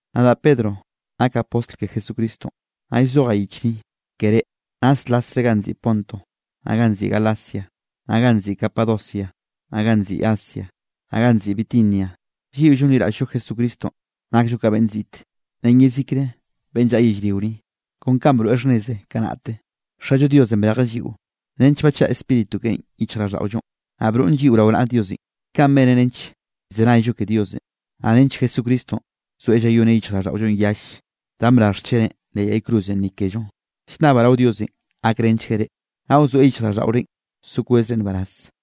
Nadaꞌ Pedro nakaꞌ postl ke Jesucristonꞌ, naꞌ llzojaꞌ yich ni ke reꞌ, naslasre ganꞌ nziꞌi Ponto, naꞌ ganꞌ nziꞌi Galacia, naꞌ ganꞌ nziꞌi Capadocia, naꞌ ganꞌ nziꞌi Asia, naꞌ ganꞌ nziꞌi Bitinia. Lliꞌo llonliraꞌll-llo Jesucristonꞌ nakllo ka beꞌnn ziꞌte, ren yezikre beꞌnne llaꞌa yellrio ni. Kon kanꞌ broeꞌ xhnneze kanaꞌte, Xallo Diosenꞌ brejeꞌ lliꞌo nench bachaꞌa Spíritu keꞌen yichjraꞌlldaꞌollonꞌ, naꞌ broꞌn lliꞌo rao naꞌa Diosenꞌ. Kaꞌn beneꞌ nench llzenayllo ke Diosenꞌ, naꞌ nench Jesucristonꞌ zoeꞌ llayoneꞌ yichjraꞌlldaꞌollonꞌ yalle, danꞌ brarj xcheneꞌn leꞌ yay cruzenꞌ ni kello. Llnnabaꞌ rao Diosenꞌ gakrenchgueꞌ reꞌ, naꞌ wzoeꞌ yichjraꞌlldaꞌorenꞌ so kwezre nbaraz.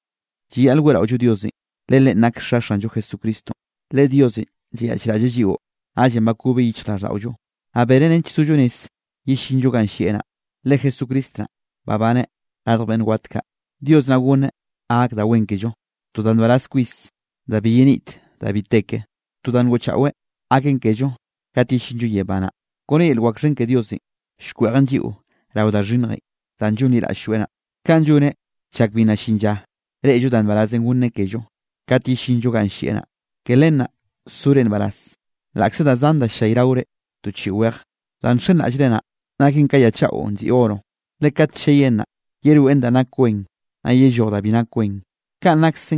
Llayaꞌl weꞌraollo Diosenꞌ le Leꞌen nak Xa Xanllo Jesucristonꞌ. Le Diosenꞌ llayaꞌchraꞌlleꞌ lliꞌo, naꞌllenꞌ bakobeꞌ yichjraꞌlldaꞌollo, naꞌ beneꞌ nench sollo rez yellinllo ganꞌ llieꞌ naꞌ, le Jesucristo naꞌ babaneꞌ radj beꞌnn wat kaꞌ. Dios naꞌ goneꞌ ga gak da wen kello, to da nbaraz kwis da bi yenit da bi te ke, to da ngoꞌchaꞌweꞌ gaken kello kat yellinllo yebá naꞌ. Kone yel wak xhen ke Diosenꞌ, llkweꞌjen lliꞌo rao da xhinnjenꞌ danꞌ llonliraꞌll-lloeꞌ naꞌ, kaꞌn lloneꞌ chak bi nna llin lla reꞌllo da nbarazenꞌ gonneꞌ kello kat yellinllo ganꞌ llieꞌ naꞌ. Ke len naꞌ sore nbaraz laꞌkze da zan da ll-llayraore to chiꞌi weje. Danꞌ nxenraꞌllre naꞌ naken ka ya chaꞌo nziꞌi oro, le kat cheyen naꞌ, yeroeꞌn da nak wen, naꞌ yelloj da bi nak wen. Kanꞌ nakse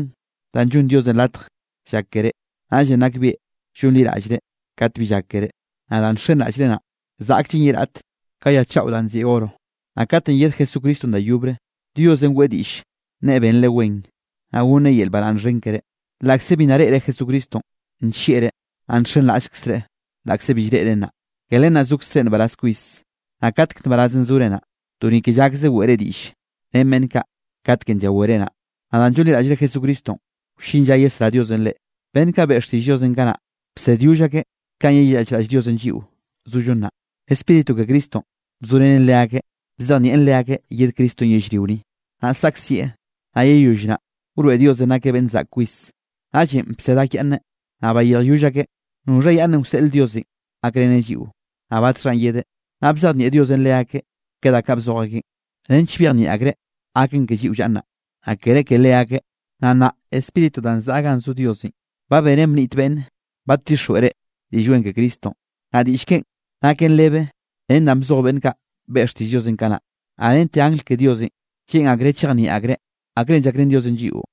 danꞌ llonn Diosenꞌ latj llak keré. Naꞌllenꞌ nakbieꞌ llonliraꞌllre kat bi llak keré. Naꞌ danꞌ nxenraꞌllre naꞌ, zaꞌkllen ye raꞌt ka ya chaꞌo danꞌ nziꞌi oro. Naꞌ katenꞌ yed Jesucristonꞌ da yobre, Diosenꞌ weꞌe diꞌll nneꞌe benre wen, naꞌ gonneꞌ yel baraꞌnn xhen keré. Laꞌkze bi nna reꞌre Jesucristonꞌ, nllieꞌreꞌ. Naꞌ nxenraꞌllkzreꞌ laꞌkze bi llreꞌreꞌ nnaꞌ. Ke len naꞌ zokzre nbaraz kwis. Naꞌ katek nbaraz zore naꞌ, to ni ke llakzre weꞌre diꞌll ren beꞌnn kaꞌ katkenꞌ llawere naꞌ. Naꞌ danꞌ llonliraꞌllre Jesucristonꞌ, wllin lla yesrá Diosenꞌ reꞌ. Beꞌnn kaꞌ beꞌe xtiꞌll Diosenꞌ kanaꞌ, bsedyoll akeꞌ kanꞌ yeyaꞌchraꞌll Diosenꞌ lliꞌo zollo nnaꞌ. Spíritu ke Cristonꞌ bzorenen leakeꞌ, bzejnieꞌn leakeꞌ yed Cristonꞌ yellrio ni, naꞌ saꞌkzieꞌ, naꞌ yeyoll naꞌ, wroeꞌ Diosenꞌ nakeꞌ beꞌnn zaꞌk kwis. Naꞌllenꞌ bsed akyaꞌnneꞌ, naꞌ bayirjyoll akeꞌ, noxha yaꞌnnenꞌ wseꞌl Diosenꞌ gakreneꞌ lliꞌo, naꞌ batxhanꞌ yedeꞌ. Naꞌ bzejnieꞌ Diosenꞌ leakeꞌ ke da kaꞌ bzoj akeꞌn, nench byejnieꞌ akreꞌ gaken ke lliꞌo llaꞌa nnaꞌ, naꞌ kere ke leakeꞌ. Naꞌ nnaꞌ Spíritu danꞌ zaꞌa ganꞌ zo Diosenꞌ, ba benen bniꞌt beꞌnn badtixjweꞌ reꞌ Diꞌll Wen ke Cristonꞌ, naꞌ diꞌll keꞌen naken rebe ren danꞌ bzoj beꞌnn kaꞌ beꞌe xtiꞌll Diosenꞌ kanaꞌ. Naꞌ rente angl ke Diosenꞌ lleꞌn akreꞌ chejnieꞌ akreꞌ akrenꞌ llakrén Diosenꞌ lliꞌo.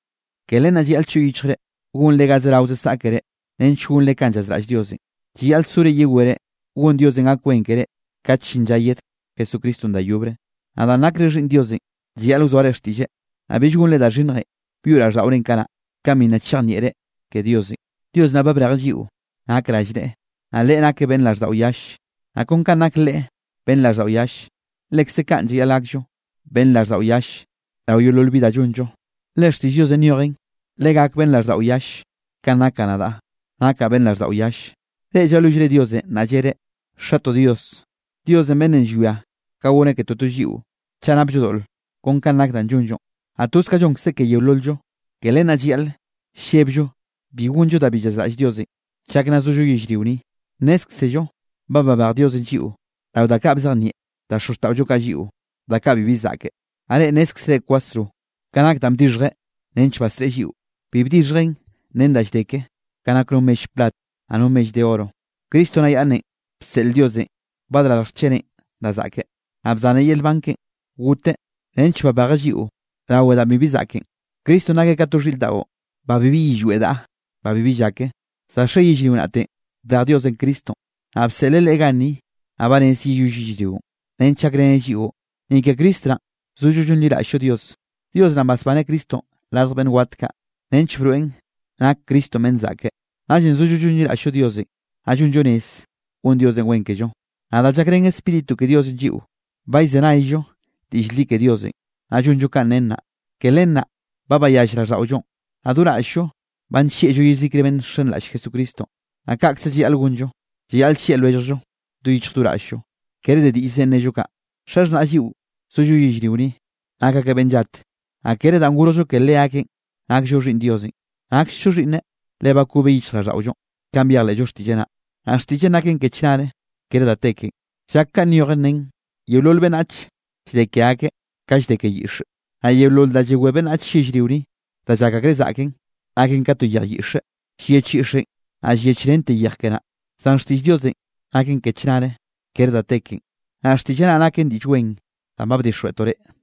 Ke len naꞌ llayaꞌl choꞌ yichjre gonre ga zerao saꞌkere nench gonre kanꞌ llazraꞌll Diosenꞌ. Llayaꞌl sore yewere gon Diosenꞌ gak wen keré kat llin lla yed Jesucristonꞌ da yobre. Naꞌ danꞌ nakre xhiꞌnn Diosenꞌ llayaꞌl wzoare xtiꞌlleꞌ, naꞌ bill gonre da xhinnjenꞌ byoꞌ raꞌlldaꞌorenꞌ kanaꞌ, kanꞌ bi nna chejnieꞌre ke Diosenꞌ. Dios naꞌ ba brejeꞌ lliꞌo nak rallneꞌe, naꞌ Leꞌe nakeꞌ beꞌnn raꞌlldaꞌo yalle. Naꞌ kon ka nak Leꞌe beꞌnn raꞌlldaꞌo yalle, lekze kaꞌn llayaꞌl gakllo beꞌnn raꞌlldaꞌo yall rao yeolol bi da llonllo. Le xtiꞌll Diosenꞌ nyojenꞌ: “Legak beꞌnn raꞌlldaꞌo yall kanꞌ nakaꞌ nadaꞌ, nakaꞌ beꞌnn raꞌlldaꞌo yalle.” Reꞌ llalwillre Diosenꞌ naꞌ llereꞌ: “Xatoꞌ Dios”, Diosenꞌ beꞌnnenꞌ llwia ka goneꞌ ke totollo lliꞌo chaꞌ napllo doꞌle kon kanꞌ nak danꞌ llonllo, naꞌ toz kanꞌ llonkzeꞌ ke yeolol-llo, ke len naꞌ llayaꞌl llebllo bi gonllo da bi llazraꞌll Diosenꞌ chak nna zollo yellrio ni. Nnézkzello ba babej Diosenꞌ lliꞌo rao da kaꞌ bzejnieꞌ da xozxtaꞌollo kaꞌ lliꞌo, da kaꞌ bibi zaꞌke. Naꞌ reꞌ nnézkzere kwasro ka nak danꞌ bdixhjeꞌ nench basreꞌe lliꞌo, bi bdixhjeꞌn ren da llde ke, ka nak no mell plat, naꞌ no mell de oro. Cristo naꞌ yaꞌnnenꞌ bseꞌl Diosenꞌ badrarj xcheneꞌn da zaꞌke, naꞌ bzaneꞌ yel nban keꞌe goteꞌ nench babejeꞌ lliꞌo rawe danꞌ bibi zaꞌken. Cristonꞌ nakeꞌ ka to xhiꞌr daꞌo, ba bibi yillweꞌ daꞌa, ba bibi llake. Za xe yellrio naꞌtenꞌ brej Diosenꞌ Cristonꞌ, naꞌ bseꞌleꞌ Leꞌe ganni nnaꞌ ba rez yeyoll yellrionꞌ, nench gakreneꞌ lliꞌo. Ni ke Cristo naꞌn zollo llonliraꞌll-llo Dios. Dios naꞌn basbaneꞌ Cristonꞌ radj beꞌnn wat kaꞌ, nench broeꞌn nak Cristonꞌ beꞌnn zaꞌke. Naꞌllenꞌ zollo llonliraꞌll-llo Diosenꞌ, naꞌ llonllo rez gon Diosenꞌ wen kello. Naꞌ da llakrén Spíritu ke Diosenꞌ lliꞌo, ba llzenayllo diꞌll li ke Diosenꞌ, naꞌ llonllo kanꞌ nen naꞌ. Ke len naꞌ ba bayall raꞌlldaꞌollonꞌ, naꞌ do raꞌll-llo ba nllieꞌllo yezikre beꞌnn nxenraꞌll Jesucristonꞌ. Naꞌ kaꞌkze llayaꞌl gonllo, llayaꞌl llieꞌ lwelljllo do yichj do raꞌll-llo, kere de diꞌllzenꞌ nnello kaꞌ. Xaxhnaꞌ lliꞌo zollo yellrio ni, nak akeꞌ beꞌnn llat, naꞌ kere danꞌ gorjllo ke leakeꞌn nakllo xhiꞌnn Diosenꞌ, naksllo xhiꞌnneꞌ le bakobeꞌ yichjraꞌlldaꞌollonꞌ, kanꞌ byejleꞌllo xtiꞌlleꞌ naꞌ. Naꞌ xtiꞌlleꞌn naken ke chnare, kere da te kenꞌ. Llak kanꞌ nyojen, nen: Yeolol beꞌnnach llde ke akeꞌ ka llde ke yiꞌxe, naꞌ yeolol danꞌ llawé beꞌnnach yellrio ni, da llak akreꞌ zaꞌken, naken ka to yej yiꞌxe. Llyech yiꞌxenꞌ, naꞌ llyechrente yej ke naꞌ. Zan xtiꞌll Diosenꞌ naken ke chnare, kere da te kenꞌ. Naꞌ xtiꞌlleꞌ naꞌ naken Diꞌll Wen danꞌ ba bdixjweꞌtoꞌ reꞌ.